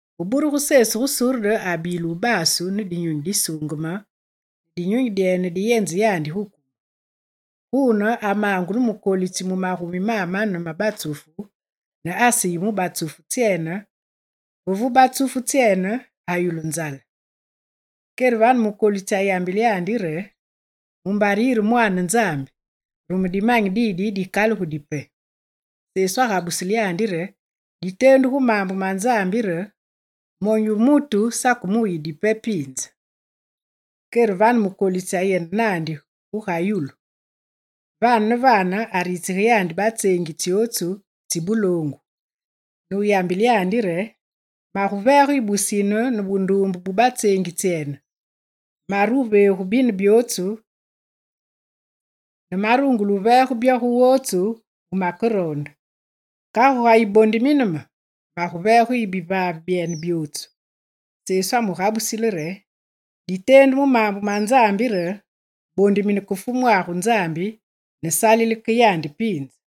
Ve burugu Sesu gu Surde abile wubasu ne Dinyunyi Disuungeme, ne Dinyunyi dyene diyenze yandi gu kumu. Guune, amaangu ne mukolitsi mu magumi mamane ma batsufu ne aseyi mu batsufu tsyene, ve vu batsufu tsyene ayulu nzale. Kere vane mukolitsi ayambile yandi re: «Mumbare yire Mwaane Nzambi, rume dimanyi didi dikalugi dipe.» Sesu agabusile yandi re: «Diteendu gu maambu ma Nzambi re: “Monyu wu mutu sake muyi dipe piinze.”» Kere vane mukolitsi ayende naandi guga yulu. Vane ne vane aritsige yandi batseengi tsyotsu tsi buloongu, ne wuyambile re: «Maguveege yu busine ne bunduumbe bu batseengi tsyene. Mare wuveegu bine byootsu ne marungule wuveege byo gu wotsu wumakeroonde.» Kagu ga yibondimine me, maguveege yu bivaave byene byootsu! Sesu amugabusile re: «Diteendu mu maambu ma Nzambi re: Bondimine ke Fumwagu Nzambi, ne salile ke yandi piinze.»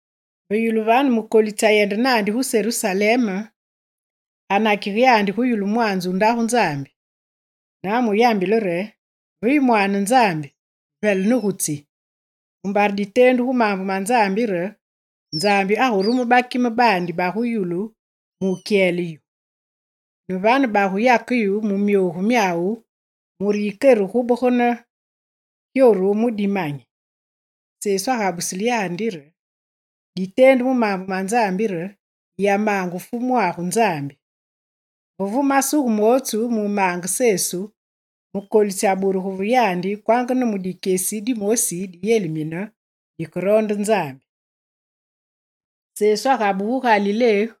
Ve yulu vane mukolitsi ayende naandi gu Serusalem, anakige yandi gu yulu mwaanze wu Ndagu Nzambi. Ne amuyambile re: «Ve yu Mwaane Nzambi, vele ne gu tsi! Mumbare diteendu gu maambu ma Nzambi re: Nzambi agurume bakime baandi bagu yulu mukyele yu.» Ne vane baguyake yu mu myogu myawu mure yikere gubegane gyoru mu dimanyi. Sesu agabusile yandi re: «Diteendu mu maambu ma Nzambi re: “Yiyamaange Fumwagu Nzambi.”» Ve vu masuge mootsu mumaange Sesu, mukolitsi aburugu ve yandi kwanga ne mu dikyesi dimosi diyelimine dikeroonde Nzambi. Sesu abaande mudyanzu wandi gu Galilé.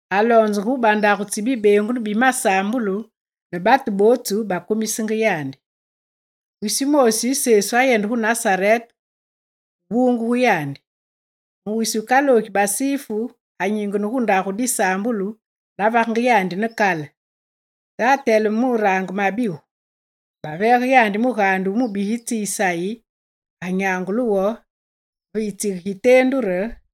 Aloonzenge gu bandagu tsi bibeengunu bi masaambulu, ne batu bootsu bakumisenge yandi. Wisi wumoosi Sesu ayende gu Nasarete gu bungugu yandi. Mu wisi wukaloogi Basifu anyingene gu ndagu disaambulu navagenge yandi ne kale. Ne ateleme murange mabigu. Baveege yandi mugaande wu mubigitsi Isayi, anyangule wo ve yitsige giteendu re: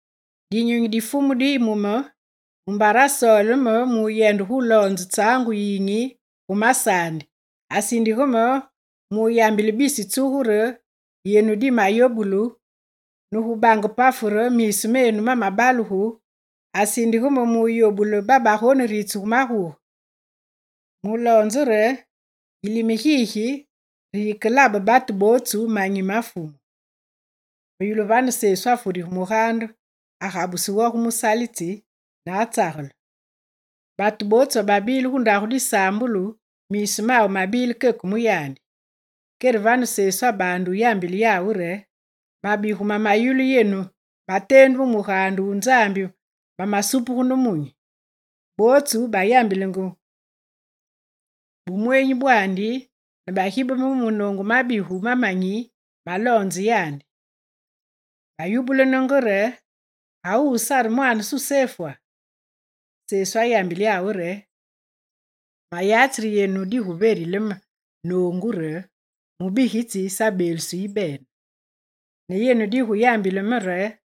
«Dinyunyi di Fumu diyi mu me, mumbare asoole me muyende guloonze tsaangu yiyinyi gu masaandi. Asindige me muyambile bisi tsugu re yenu dimayobugu, ne gu bange pafu re miisu menu mamabalugu, asindige me muyobule babagoneritsugu maguge. Muloonze re: Yilime gigi re gikelabe batu bootsu manyi ma Fumu.» Ve yulu vane Sesu afurige mugaande, agabuse wo gu musalitsi, ne atsagele. Batu bootsu bababile gu ndagu disaambulu, miisu mawu mabile keke mu yandi. Kere vane Sesu abaande wuyambile yawu re: «Mabigu mameyulu yenu mateendu mu mugaande wu Nzambi mamesupuge ne munyi.» Bootsu bayambilenge bumweenyi bwandi ne bagibeme mu munoongu mabigu ma manyi maloonzenge yandi. Bayubulenenge re: «Wuwu sare mwaane Susefwa?» Sesu ayambile yawu re: «Mayatsi re yenu diguverile me noongu re: “Mubugitsi sabeelusi yibene.” Ne yenu digubeyambile me re: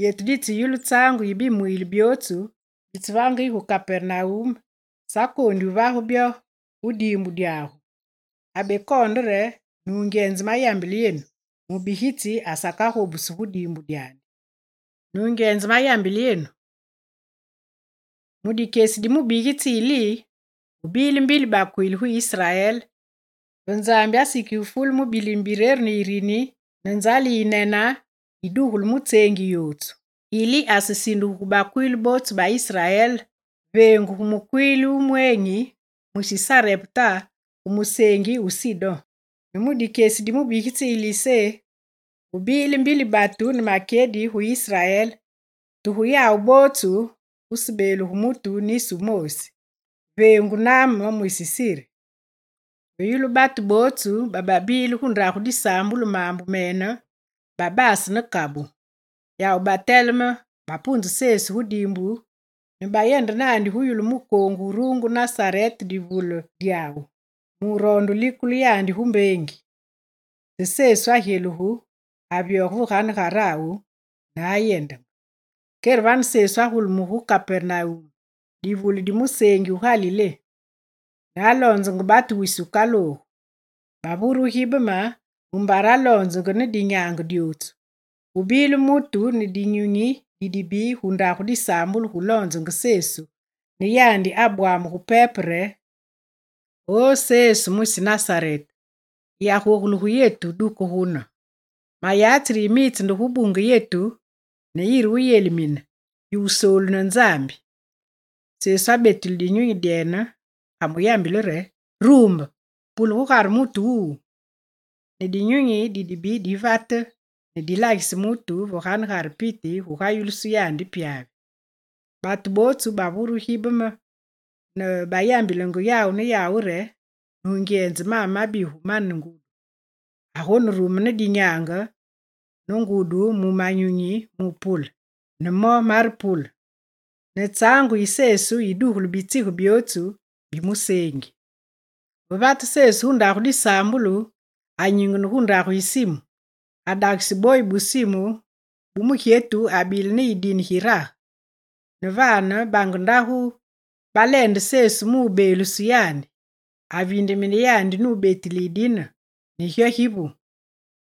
“Yetu ditseyulu tsaangu yi bimwiile byootsu bitsevage yu gu Kapernawum, sakoondi wuvage byo gu diimbu dyagu.”» Abekoonde re: «Nungyenze mayambile yenu, mubigitsi asakagobusu gu diimbu dyandi. Nungyenze mayambile yenu, mu dikyesi di mubigitsi Ili, gubile mbili bakwiili gu Israel, ve Nzambi asikige fule mu bilime bireru ne yirini, ne nzale yi yinene yidugulu mu tseengi yotsu. Ili asesindugu gu bakwiili bootsu ba Israel veengu gu mukwiili wu mweenyi, mwisi Sarepta gu museengi wu Sidon. Ne mu dikyesi di mubigitsi Ilisé gubile mbili batu ne makyedi gu Israel te gu yawu bootsu gusebeeluge mutu nisi wumoosi, veengu Naame mwisi Siri.» Ve yulu batu bootsu bababile gu ndagu disaambulu maambu mene, babase ne kabu. Yawu bateleme, bapunze Sesu gu diimbu ne bayende naandi gu yulu mukoongu wurungu Nasarete divule dyawu, muroonde wulikule yandi gu mbeengi. Te Sesu agyelugu, avyoge veganegarawu nuyendenge. Kere vane Sesu agulumuge gu Kapernawum, divule di museengi wu Galilé; ne aloonzenge batu wisi wukaloogu. Bavure gibeme mumbare aloonzenge ne dinyaange dyotsu. Gubile mutu ne dinyunyi didibi gu ndagu disaambulu gu lonzenge Sesu ne yandi abwamugu pepe re: «O Sesu mwisi Nasarete, yiyagogule gu yetu, duke gune, mayatsi re yimitse nde gubunge yetu ne yire wuyelimine, yu wutsesoolu ne Nzambi!» Sesu abetile dinyunyi dyene, amuyambile re: «Rumbe, pule gugare mutu wuwu!» Ne dinyunyi di dibi divate, ne dilagise mutu ve ganegare piti gugayulusu yandi pyavi. Bootsu bavure gibeme ne bayambilenge yawu ne yawu re: «Nungyenze maame mabigu mane ngudi, agonerume ne dinyaange ne ngudi gu manyunyi mu wupule. Ne mo marepule!» Ne tsaangu yi Sesu yidugulu bitsige byootsu bi museengi. Ve vate Sesu gu ndagu disaambulu, anyingene gu ndagu yi Simu. Adagise boyi bu Simu bu mugyetu abile ne yidine girage, ne vane bange ndagu baleende Sesu mubeeluse yandi. Aviindemine yandi nubetile yidine, ne gyo givu.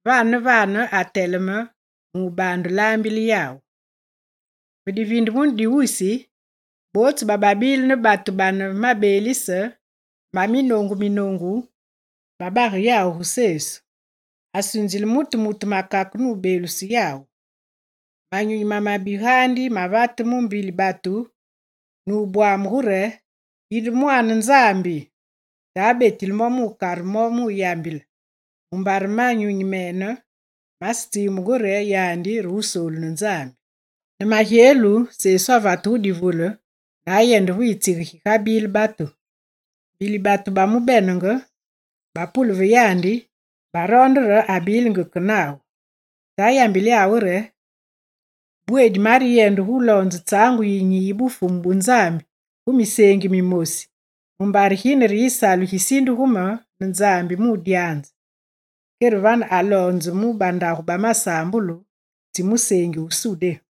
Vane ne vane ateleme, ne abaande laambile yawu. Ve diviindemunu di wisi, bootsu bababile ne batu bane mabeelise ma minoongu minoongu babage yawu gu Sesu. Asunzile mutu mutu makake nubeeluse yawu. Manyunyi mamabi gaandi mavate mu mbili batu ne wubwamugu re: «Yinde Mwaane Nzambi!» Te abetile mo nukare mo wuyambile, mumbare manyunyi mene masetsiimbungu re yandi re Wusoolu ne Nzambi. Ne magyelu, Sesu avate gu divule, nuyende ve yitsige gigabile batu. Mbili batu bamubenenge, bapule ve yandi, baroonde re abilingi ke nawu. Te ayambile yawu re: «Bweedi mareyende guloonze tsaangu yiyinyi yi Bufumu bu Nzambi gu miseengi mimosi mumbare gine re yisalu gisindugu me ne Nzambi mudyanze.» Kere vane, aloonzenge mu bandagu ba masaambulu tsi museengi wu Sudé.